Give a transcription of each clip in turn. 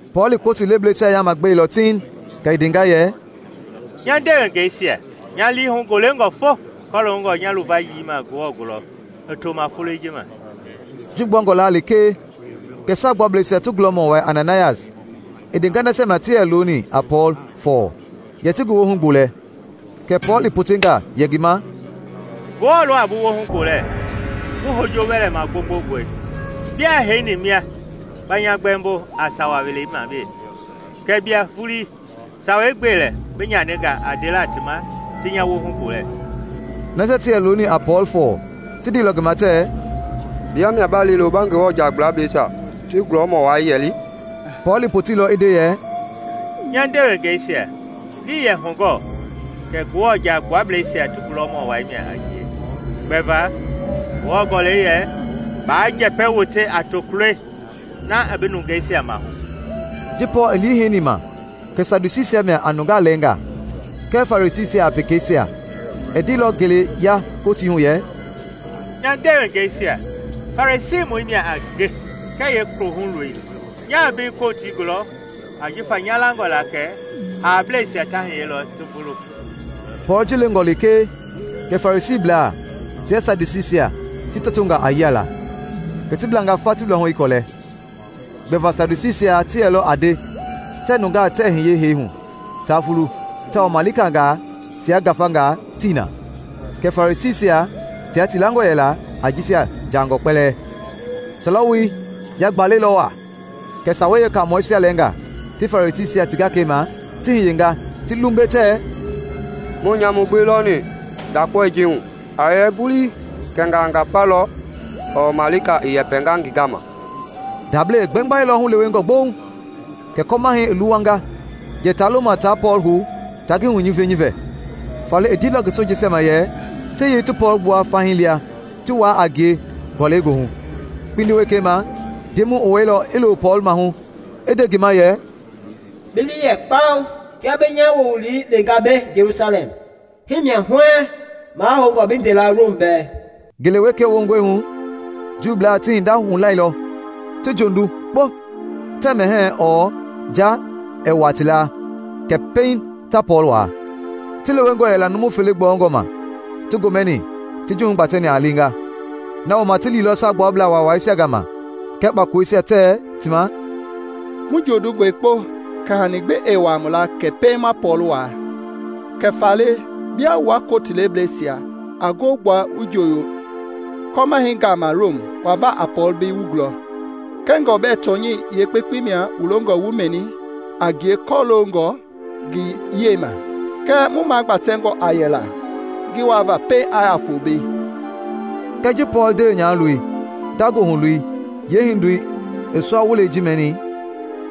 Pɔɔl i koti lebleisia yaama gbeilɔ tiiŋ kɛ i ndenga yɛ, “Nya ndewengeisia, nya liihu golengɔ fo kɔloongɔ nya luvayii ma Ngewɔ gulɔ i to ma foloi ji ma.” Ji gbuangɔ laa lekee kɛ Saagbuablɛisia ti gulɔmɔ wai Ananayas i ndenga nasia ma ti yɛ looni a Pɔɔl fɔɔ yɛ ti ngi woohu gbolɛ. Kɛ Pɔɔl i potenga yɛ ngi ma, “Ngewɔ lɔ a bi woohu gbolɛ, bi hojo wɛlɛ magbongbongoi! Biaa heini mia ba nya gbɛmbo a sawa welei ma we kɛɛ bia vuii sawei gbe lɛ bi nyaninga a ndela ti ma ti nya woohu gbolɛ!” Nasia ti yɛ looni a Pɔɔl fɔɔ ti ndeilɔ ngi ma tɛ, “Bia mia ba liilo ba Ngewɔ Jaagbuablɛisia ti gulɔmɔ wai yɛli?” Pɔɔl i poteilɔ i nde yɛ, “Nya ndewengeisia, ngii yɛ hugɔ kɛ Ngewɔ Jaagbuablɛisia ti gulɔmɔ wai mia a ngie; gbɛva Ngewɔ gɔlɛi yɛ, ‘Baa njɛpɛ wote a tokuloi na i bi nungeisia maahu.’” Ji Pɔɔl i lii heini ma kɛ Sadusiisia mia a nungaa lɛnga kɛɛ Farisiisia a pekeisia, i ndeilɔ ngele ya kotii hu yɛ, “Nya ndewengeisia, Farisiimɔi mia a ngɛ kɛɛ yeekohuloi. Nyaa mbei kotii gulɔ jifa nya langɔ la kɛ haableisia ta hiyelɔ ti vulu!” Pɔɔl ji lengɔ lekee kɛ Farisiiblaa tia Sadusiisia ti tɔtonga a yiala, kɛ ti blanga fa ti luahu i kuɛlɔ. (Gbɛva Sadusiisia ti yɛlɔ a nde tɛ nungaa tɛɛ hiye heehu ta vulu tawao malikangaa tia ngafangaa tii na; kɛɛ Farisiisia tia ti langɔ yɛla a jisia jaangɔ kpɛlɛɛ.) Sɔlɛ woi yagbalɛilɔ waa, kɛ sawei yeekaamɔisia lɛnga ti Farisiisia ti gakeima ti hiyenga ti lumbe tɛɛ, “Muii nyamu gbi lɔni ndakpaoi ji hu! A yɛ vuii kɛnga a ngafa lɔ ɔɔ malika i yɛpɛnga ngi gama!” Ndablei i gbengbailɔ hulewengɔ gboŋ kɛ kɔmahɛi i luwanga yɛ ta loma ta Pɔɔl hou ta ngi hunyivinyivi. Faale i ndeilɔ ngi sojeisia ma yɛ ti yei ti Pɔɔl gbua fahii lia ti wuaa a ngie gɔlɛi goohu. Kpindi wekei ma Ndemɔi i wɛilɔ i loo Pɔɔl maahu i nde ngi ma yɛ, “Bi lii yɛ kpao! Kia bi nya wowili lenga mbei Jelusalɛm, himia huɛɛŋ mahoungɔ bi ndela Rom bɛɛ.” Ngele wekei wongɔi hu Juublaa ti hinda hulailɔ ti jondu kpo tɛ mɛhɛɛ ɔɔ nja ɛɛ wuaa ti laa kɛ pɛiŋ ta Pɔɔl waa. Ti lewengɔ yɛla numu fele gbɔyɔngɔ ma ti gomɛni ti ji hugbatɛni a lenga. Nawooma ti liilɔ Saagbuablaa Waawaisia gama kɛɛ kpakoloisia tɛ ti ma, “Mu jondungɔe kpo kɛ hani gbi ɛɛ wuaa mu laa kɛ pɛiŋ ma Pɔɔl waa. Kɛ faale, bia wua kotilebleisia a ngoo gbua wu jooyo kɔmahɛi gama Rom wa va a Pɔɔl mbei wu gulɔ, kɛngɔ bɛ tɔnyɛi yeekpekpe mia wu longɔ wu mɛni a ngie kɔloongɔ ngi yiɛi ma. Kɛɛ mu magbatɛngɔ a yɛla ngi waa va pɛiŋ a ya fo mbei.” Kɛɛ ji Pɔɔl ndewe nyahaloi nda goohu loi yeehindoi i sua wulei ji mɛnini,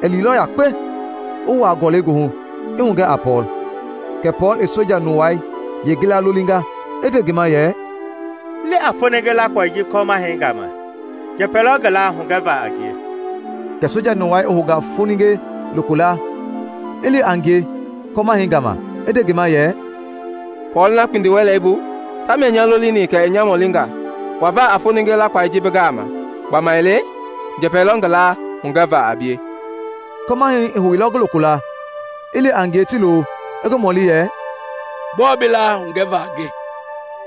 i liilɔ yakpe i wuaa gɔlɛi goohu i hugɛ a Pɔɔl. Kɛ Pɔɔl i soja nuwai yeengila lolinga i nde ngi ma yɛ, “Li a foninge lakpaoi ji kɔmahɛi gama; njɛpɛ lɔ ngi laa hugɛva a ngie.” Kɛ soja nuwai i hounga foninge lokolaa i li a ngie kɔmahɛi gama i nde ngi ma yɛ, “Pɔɔl na kpindiwɛleibu tamia i nya lolini kɛɛ i nya mɔlinga wa va a foningee lakpaoi ji bi gama, gbamaile njɛpɛ lɔ ngi laa hugɛva a bie.” Kɔmahɛi i houilɔ ngi lokolaa, i li a ngie ti loo i ngi mɔli yɛ, “Gbɔɔ bi laa hugɛva a nge?”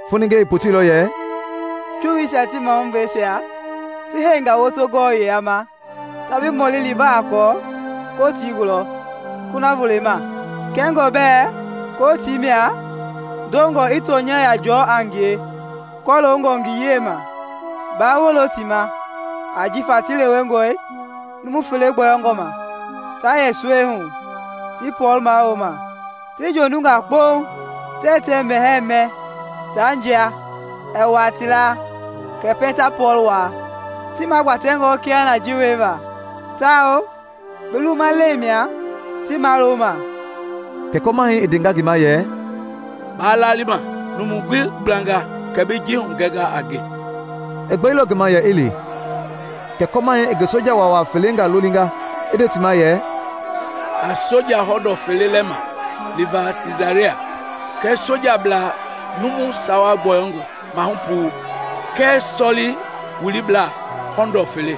Foninge i poteilɔ yɛ, “Juuisia ti mahubleisia ti heinga woto gɔwɔ yila ma ta bi mɔli liva a Pɔɔl kotii gulɔ sina voloi ma, kɛngɔ bɛ kotii mia dongɔ i tɔnya yia jɔɔ a ngie kɔloongɔ ngi yiɛi ma. Baa wolo ti ma, ajifa ti lewengɔi numu fele gbɔyɔngɔ ma ta yɛ suɛi hu ti Pɔɔl mawulo ma. Ti jondunga kpo tɛ mɛhɛɛ tia nja ɛɛ wuaa ti laa kɛ pɛiŋ ta Pɔɔl waa. Ti magbatɛngɔi kiahuna ji wieva, tawao bi lumalɛi mia ti mawuloma.” Kɛ kɔmahɛi i ndenga ngi ma yɛ, “Baa lali ma numu gbi gblanga kɛ bi ji hugɛnga a nge.” I gbeilɔ ngi ma yɛ i li. Kɛ kɔmahɛi i ngi soja waawaa felengaa lolinga i nde ti ma yɛ, “A soja hɔndɔ fele lɛma liva Siisaria, kɛɛ sojiablaa numu sawa gbɔyɔngɔ mahu-puu, kɛɛ sɔli-wiliblaa hɔndɔ fele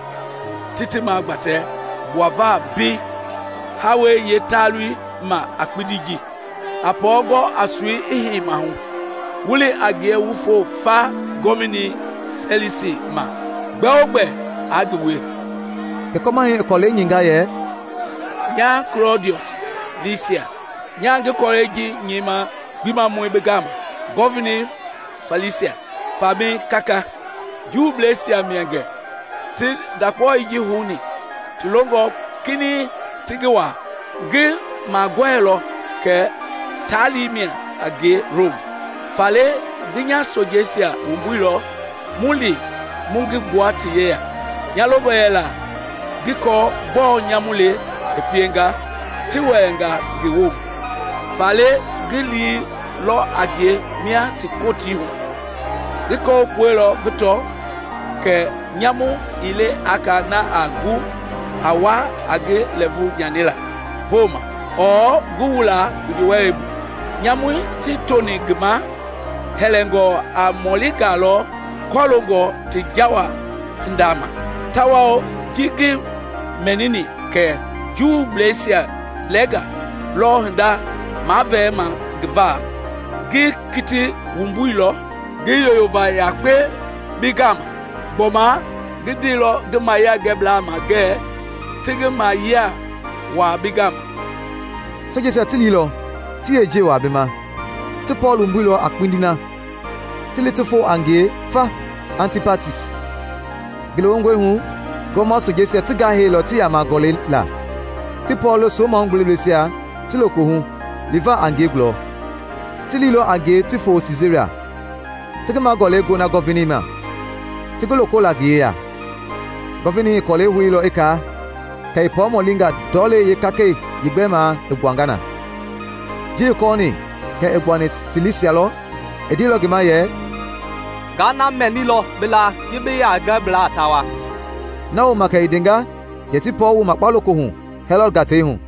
ti ti magbatɛ gbuava mbei haawɛi yee taalu ma a kpindi ji. A Pɔɔl gɔ a soi i hei mahu, wu li a ngie wu fo fa Gɔvinei Fɛlisi ma gbɛogbɛ a ngi wie.” Kɛ Kɔmahɛi i kɔlɛi nyɛinga yɛ: “Nya Kulɔdiɔs Lisias, nyaa ngi kɔlɛi ji nyɛima Gbimamɔi bi gama, Gɔvinei Fɛlisi: Famɛi kaka. Juubleisia mia gɛ ti ndakpaoi ji houni ti longɔ kinɛiŋ ti ngi waa. Ngi magɔɛilɔ kɛ taali mia a ngie Rom, faale ngi nya sojeisia wumbuilɔ mu li mu ngi gbua ti yeya. Nya longɔ yɛla ngi kɔɔ gbɔɔ nyamu le i pienga ti wɛlɛnga ngi woma; faale ngi liilɔ a ngie mia ti kotii hu. Ngi kɔwukpueilɔ ngi tɔ kɛ nyamu ii le a ka na a gu a wa a ngi lɛɛvu nyanila poma ɔɔ ngi wula kpindiwɛlɛbu: nyamui ti toni ngi ma hɛlɛngɔ a mɔlingaa lɔ kɔloongɔ ti jawa hinda ma. Tawao ji ngi mɛnini kɛ Juubleisia lɛnga lɔ hinda mavɛɛma ngi va, ngi kiti wumbuilɔ ngi yoyova yakpe bi gama. Gbɔma ngi ndeilɔ ngi mayiangɛblaa ma ngɛ ti ngi mayiɛi waa bi ma.” Sojeisia ti liilɔ ti yeejiɛi waa bi ma. Ti Pɔɔl wumbuilɔ a kpindi na ti li ti fo a ngie fa Antipatis. Ngele wongɔi hu gɔɔma sojeisia ti gahɛilɔ ti yama gɔlɛi la, ti Pɔɔl lo so-mahugbebleisia ti lokohu liva a ngie gulɔ. Ti liilɔ a ngie ti fo Siisaria, ti ngi magɔlɛi gona Gɔvinei ma ti ngi loko la ngi yeya. Gɔvinei i kɔlɛi houilɔ i kaa, kɛ i Pɔɔl mɔlinga ndɔlei yekakei yeegbɛmaa i gbuanga na. Ji i kɔɔni kɛ i gbuani Silisia lɔ, i ndeilɔ ngi ma yɛ, “Nga na mɛnilɔ bi laa ji bi yiangɛblaa ta wa.” Na wooma kɛ i ndenga yɛ ti Pɔɔl wu makpa lokohu Hɛlɔd gatei hu.